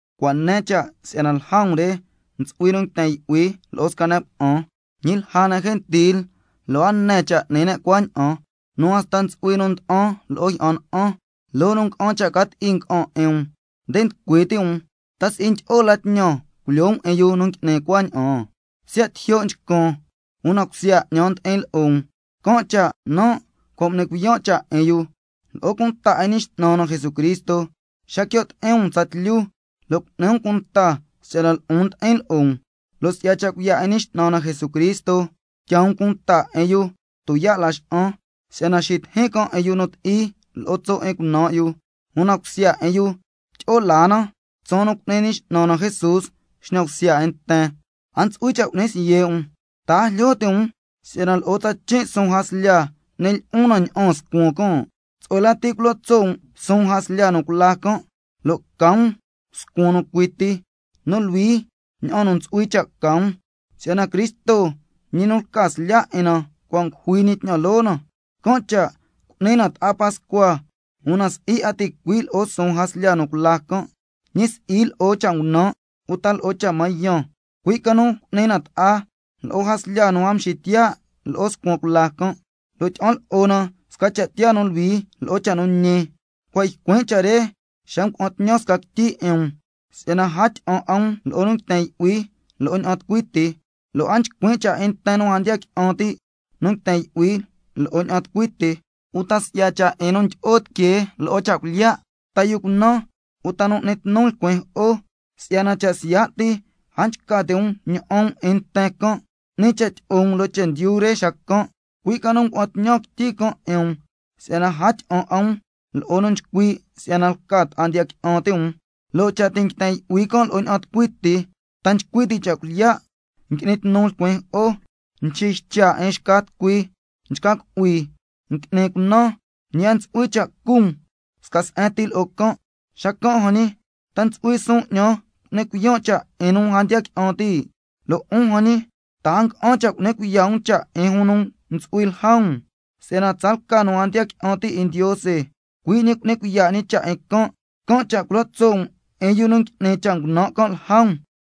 Cua' ne cha' si'yana lja um re ntsu'hui nu nguiten yu'hui lo'o sca ne' cuna'an, ñi lja ne' gentil lo' a ne cha' n'ni ne' cuaña'an, nu hasta ntsu'hui nu nda'an lo'o jyi'an na'an. ¡Loo nu nga'an cha' ca ti'i nga'an 'in um, nde nducui ti' um! ¿Ta si'i ndyi'o la tñan culyoo um 'in yu nu ngui'ni cuaña'an? Siya' tijyo' nchcan, una cusya 'ñan ndi'in lo'o um, can' cha' nan' cua' m'ni cuiyan' cha' 'in yu. Lo'o cunta 'in Ñi X'nan na Jesucristo xa quio' ti'in um tsatlyu, lo' cu'ni um cunta si'yana lo'on ndi'in lo'o um, lo' si'ya cha' cuiya' 'in Ñi X'nan na Jesucristo, tyaa um cunta 'in yu tuyaa' Laxa'an, si'yana xitijin can' 'in yu nu ti'i lo'o tso' 'in cunan' yu, una cusya 'in yu tyi'o laa na tsaan nu cu'ni Ñi X'nan na Jesús xñan bsya 'in nten. Can' cha' a ntsu'hui cha' cu'ni siye' um. ¿Ta a jlyo ti' um si'yana lo'o tsachin' suun jaslya n'ni lyi'un na ña'aan scuan can'? Tsu'hue lati culo tso' um suun jaslya nu cula can', lo' ca um scuan nu cui ti, nu luhui ña'an nu ntsu'hui cha' ca um, si'yana Cristo ñi nu lca slya' 'in na, cua' ngujui ñi tñan loo na. Can' cha' cu'ni na ta'a pascua, una si'i 'a ticui' lo'o suun jaslya nu cula can', ñi si'i lo'o cha' ngunan' uta lo'o cha' mañan, cui' ca nu cu'ni na ta'a lo'o jaslya nu a mxitiyaa' lo'o scuan cula can', lo' tyi'an lo'o na sca cha' tiyaa nu luhui lo'o cha' nu ñi. Cua' ycuin' cha' re xa ngua'an tñan sca quityi 'in um, si'yana a tyi'an 'a um lo'o nu nguiten yu'hui lo'o ña'an tucui ti, lo' a nchcuin' cha' 'in nten nu a ndiya qui'an ti', nu nguiten yu'hui lo'o ña'an tucui ti, uta si'ya cha' 'in nu ndyi'o tiquee lo'o cha' cuilyiya', ta yu cunan, uta nu n'ni tnu lcuin jo'o, si'yana cha' siya' ti a nchca ti' um ña'an um 'in nten can', 'ni cha' tyi'o um loo chendyu re xacan'. Cui' ca nu ngua'an tñan quityi can' 'in um si'yana a tyi'an 'a um lo'o nu nchcui' si'yana lca ta'a ndiya qui'an ti' um, lo' cha' ti' nguiten yu'hui can' lo'o ña'an tucui ti, ta nchcui ti' cha' cuilyiya', ngui'ni tnu lcuin jo'o, nxiycha' 'in xca tucui, nchca cu'hui, ngui'ni cunan, ñi a ntsu'hui cha' cu um sca se'en ti lo'o can'. Xacan' jan ñi, ¿ta ntsu'hui suun 'ñan cu'nin cuiyan' cha' 'in nu a ndiya qui'an ti'? Lo' 'un jan ñi, ¿ta a nga'an cha' cu'ni cuiya' um cha' 'in jun nu ntsu'hui lja um? Si'yana tsalca nu a ndiya qui'an ti' 'in Ndiose, cui' ñi cu'ni cuiya' ñi cha' 'in can'. Can' cha' —culo tso' um 'in yu nu ngui'ni cha' ngunan' can' lja um—.